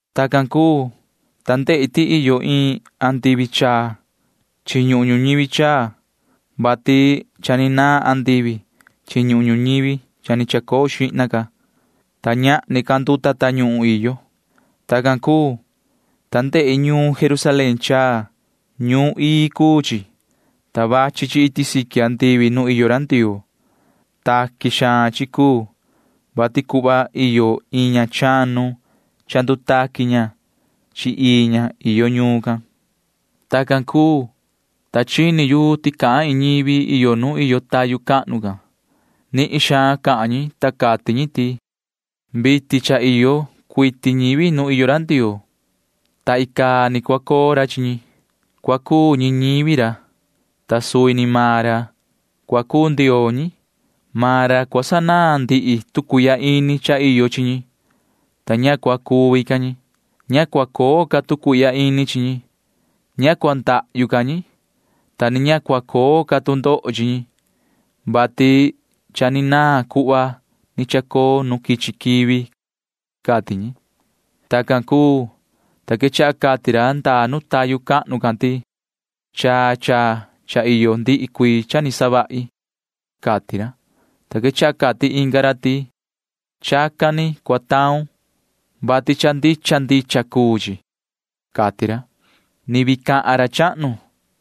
Tacan cuu, ta ndehi ti iyo iin andivi chaa chi ñuhun ñuñivi chaa, vati cha ni naan andivi chi ñuhun ñuñivi cha ni chacoo xihna ca, ta ñahni ca nduta tañuhun iyo. Tacan cuu, ta ndehi ñuun Jerusalén chaa. Ñuun ii cuu chi, ta vachi chi iti siqui andivi nu iyo ra Ndioo. Taqui xaan chi cuu, vati cuhva iyo iin ña chanu cha ndutaqui ña chi ii ña iyo ñuun can. Tacan cuu, ta chini yu ti cahan iin ñivi iyo nu iyo tayu cahnu can. Nihin suhva cahan ñi, ta cati ñi ti: ―Vitin cha iyo cuiti ñivi nu iyo ra Ndioo, ta icaa ni cua coo ra chi ñi. Cua cuu ñi ñivi ra, ta suvi ni maan ra Ndioo cua coo chi ñi. Maan ra cua sanaan ndihi tu cuihya ini cha iyo chi ñi, ta ña cua cuvi ca ñi. Ña cua coo ca tu cuihya ini chi ñi. Ña cua ndahyu ca ñi, ta ni ña cua coo ca tu ndoho chi ñi, vati cha ni naan cuhva ni chacoo nu quichi quivi ―cati ñi. Tacan cuu, ta quechaha cati ra ndaa nu tayu cahnu can ti: ―Chaa chaa cha iyo ndihi cuii cha ni savahi ―cati ra. Ta quechaha cati inga ra ti: ―Chacan ni cua taun, vati cha ndicha ndicha cuu chi ―cati ra. Ni vii cahan ra chahnu,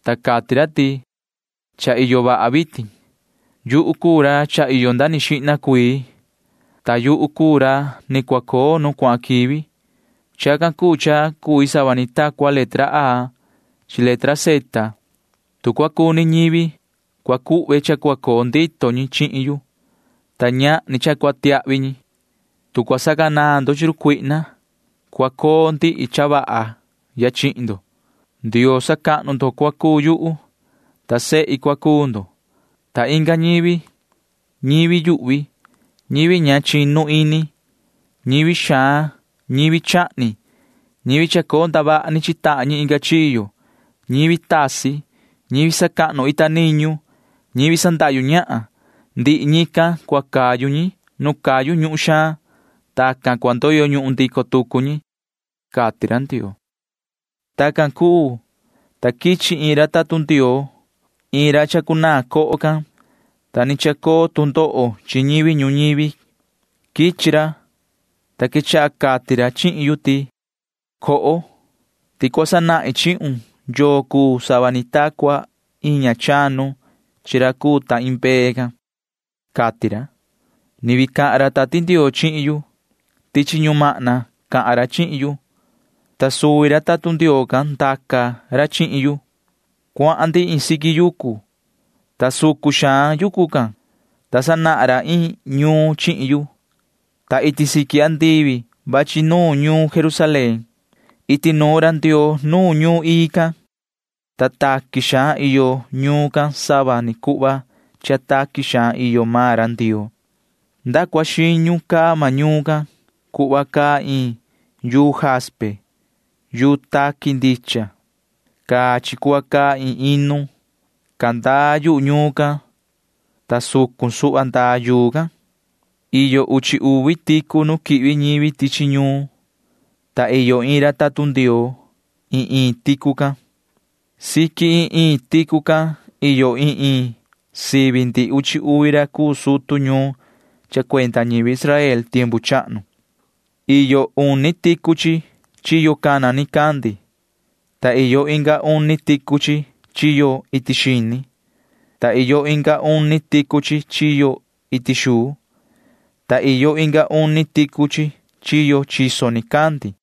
ta cati ra ti: ―Cha iyo vaha vitin. Yuhu cuu ra cha iyo nda ni xihna cuii, ta yuhu cuu ra ni cua coo nu cuahan quivi. Chacan cuu cha cui sava ni ta cua letra A chi letra Z. Tu cua cuni ñivi, cua cuhve cha cua coo ndito ñi chihin yu, ta ñahni cha cua tiahvi ñi. Tu cua sacanaan ndo chi run cuihna, cua coo ndihi cha vaha ya chihin ndo. Ndioo sacahnu ndo cua cuu yuhu, ta sehi cua cuu ndo. Ta inga ñivi―ñivi yuhvi, ñivi ña chinu ini, ñivi xaan, ñivi chahni, ñivi chacoo ndavaha ni chi tahan ñi inga chiyo, ñivi tasi, ñivi sacahnu ita niñu, ñivi sandahyu ñahan―ndihi ñican cua cayu ñi nu cayu ñuhun xaan. Tacan cua ndoyo ñuhun ndico tucu ñi ―cati ra Ndioo. Tacan cuu, ta quichi iin ra tatun Ndioo―iin ra chacunaan coho can, ta ni chacoo tu ndoho chi ñivi ñuñivi. Quichi ra, ta quechaha cati ra chihin yu ti: ―Coho, ti cua sanahin chihun yoo cuu sava ni ta cua iin ña chanu chi ra cuu ta iin mbee can ―cati ra. Ni vii cahan ra Tati Ndioo chihin yu. Tichi ñumahna cahan ra chihin yu, ta suvi ra tatun Ndioo can ndaca ra chihin yu. Cuahan ndi iin siqui yucu, ta sucun xaan suhva yucu can, ta sanahan ra iin ñuun chihin yu, ta iti siqui andivi vachi nuun ñuun Jerusalén. Iti nuun ra Ndioo nuun ñuun ii can. Taqui xaan iyo ñuun can sava ni cuhva cha taqui xaan iyo maan ra Ndioo. Nda cua xiñu caa maan ñuun can cuhva caa iin yuu jaspe yuu taqui ndicha. Caa chi cuhva caa iin inu. Candaa yuhu ñuun can, ta sucun suhva ndaa yuu can. Iyo uchi uvi ticu nu quihvi ñivi tichi ñuun, ta iyo iin ra tatun Ndioo iin iin ticu can. Siqui iin iin ticu can iyo iin iin sivi ndihi uchi uvi ra cuu sutu ñuun cha cuenda ñivi Israel tiempu chahnu. Iyo uni ticu chi chiyo cana nicandi, ta iyo inga uni ticu chi chiyo iti xini, ta iyo inga uni ticu chi chiyo iti xuu, ta iyo inga uni ticu chi chiyo chiso nicandi.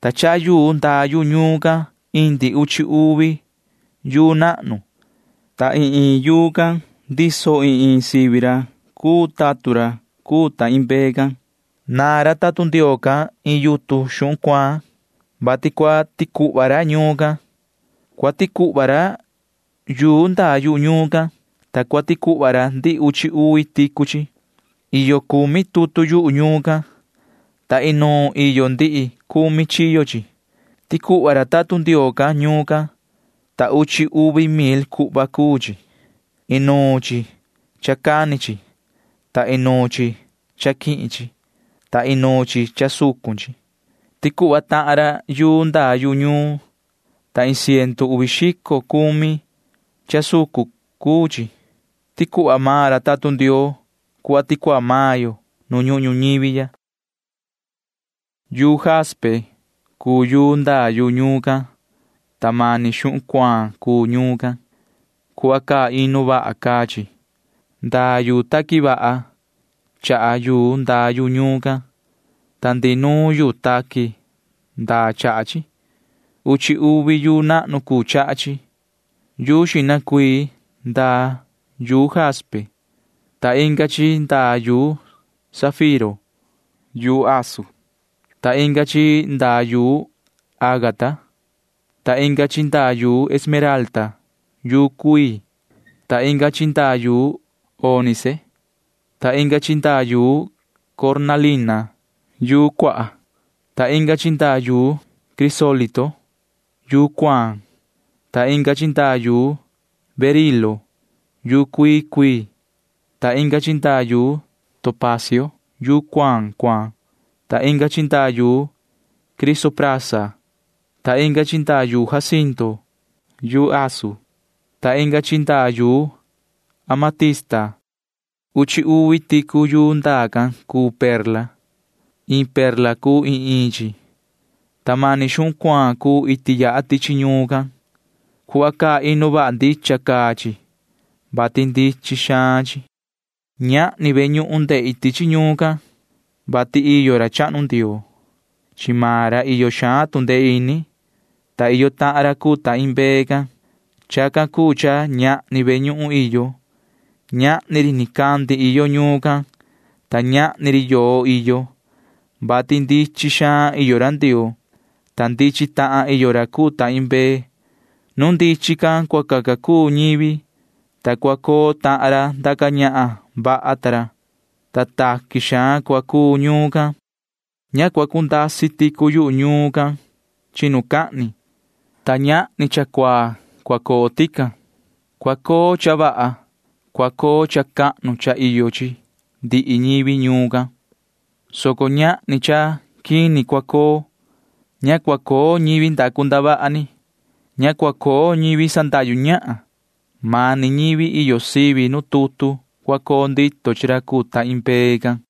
Ta chaha yuu ndaa yu ñuun can indi uchi uvi yuu nahnu, ta iin iin yuu can ndiso iin iin sivi ra cuu tatun ra cuu ta iin mbee can. Naan ra tatun Ndioo can iin yutun xuhun cuaan, vati cua ticuhva ra ñuun can. Cua ticuhva ra yuu ndaa yu ñuun can, ta cua ticuhva ra ndihi uchi uvi ticu chi. Iyo cumi tutu yuhu ñuun can, ta inuun iyo ndihi cumi chiyo chi. Ticuhva ra tatun Ndioo can ñuun can, ta uchi uvi mil cuhva cuu chi. Inuun chi cha cani chi, ta inuun chi cha quihin chi, ta inuun chi cha sucun chi. Ticuhva tahan ra yuu ndaa yu ñuun, ta iin ciendu uvi xico cumi cha soco cuu chi. Ticuhva maan ra tatun Ndioo cuhva ticuhva maan yo nu ñuhun ñuñivi ya. Yuu jaspe cuu yuu ndaa yu ñuun can, ta mani xuhun cuaan cuu ñuun can. Cuhva caa inu vaha caa chi. Ndaa yuu taqui vaha chaha yuu ndaa yu ñuun can, ta ndihi nuun yuu taqui ndaa chaha chi. Uchi uvi yuu nahnu cuu chaha chi. Yuu xihna cuii ndaa yuu jaspe, ta inga chi ndaa yuu safiro yuu asun, ta inga chi ndaa yuu ágata, ta inga chi ndaa yuu esmeralda yuu cuii, ta inga chi ndaa yuu ónice, ta inga chi ndaa yuu cornalina yuu cuaha, ta inga chi ndaa yuu crisólito yuu cuaan, ta inga chi ndaa yuu berilo yuu cuii cuii, ta inga chi ndaa yuu topacio yuu cuaan cuaan, ta inga chi ndaa yuu crisoprasa, ta inga chi ndaa yuu jacinto yuu asun, ta inga chi ndaa yuu amatista. Uchi uvi ticu yuu ndaa can cuu perla. Iin perla cuu iin iin chi, ta mani xuhun cuaan cuu iti yaha tichi ñuun can. Cuhva caa inu vaha ndicha caa chi, [vati ndichin xaan chi]. Ñahni ve ñuhun ndehi tichi ñuun can, vati iyo ra chahnu Ndioo. Chi maan ra iyo xaan tu ndee ini, ta iyo tahan ra cuu ta iin mbee can. Chacan cuu cha ñahni ve ñuhun iyo. Ñahni ri nicandi iyo ñuun can, ta ñahni ri yoo iyo, vati ndichin xaan iyo ra Ndioo, ta ndichin tahan iyo ra cuu ta iin mbee. Nu ndichin can cua caca cuu ñivi, ta cua coo tahan ra ndaca ñahan vaha ta ra, ta taqui xaan cua cuu ñuun can. Ña cua cundasi ticu yu ñuun can chinucahni, ta ñahni cha cuaa cua coo tican. Cua coo cha vaha. Cua coo cha cahnu cha iyo chi ndihi ñivi ñuun can, soco ñahni cha quini cua coo. Ña cua coo ñivi ndacu ndavaha ni. Ña cua coo ñivi sandahyu ñahan. Mani ñivi iyo sivi nu tutu cua coo ndito chi ra cuu ta iin mbee can.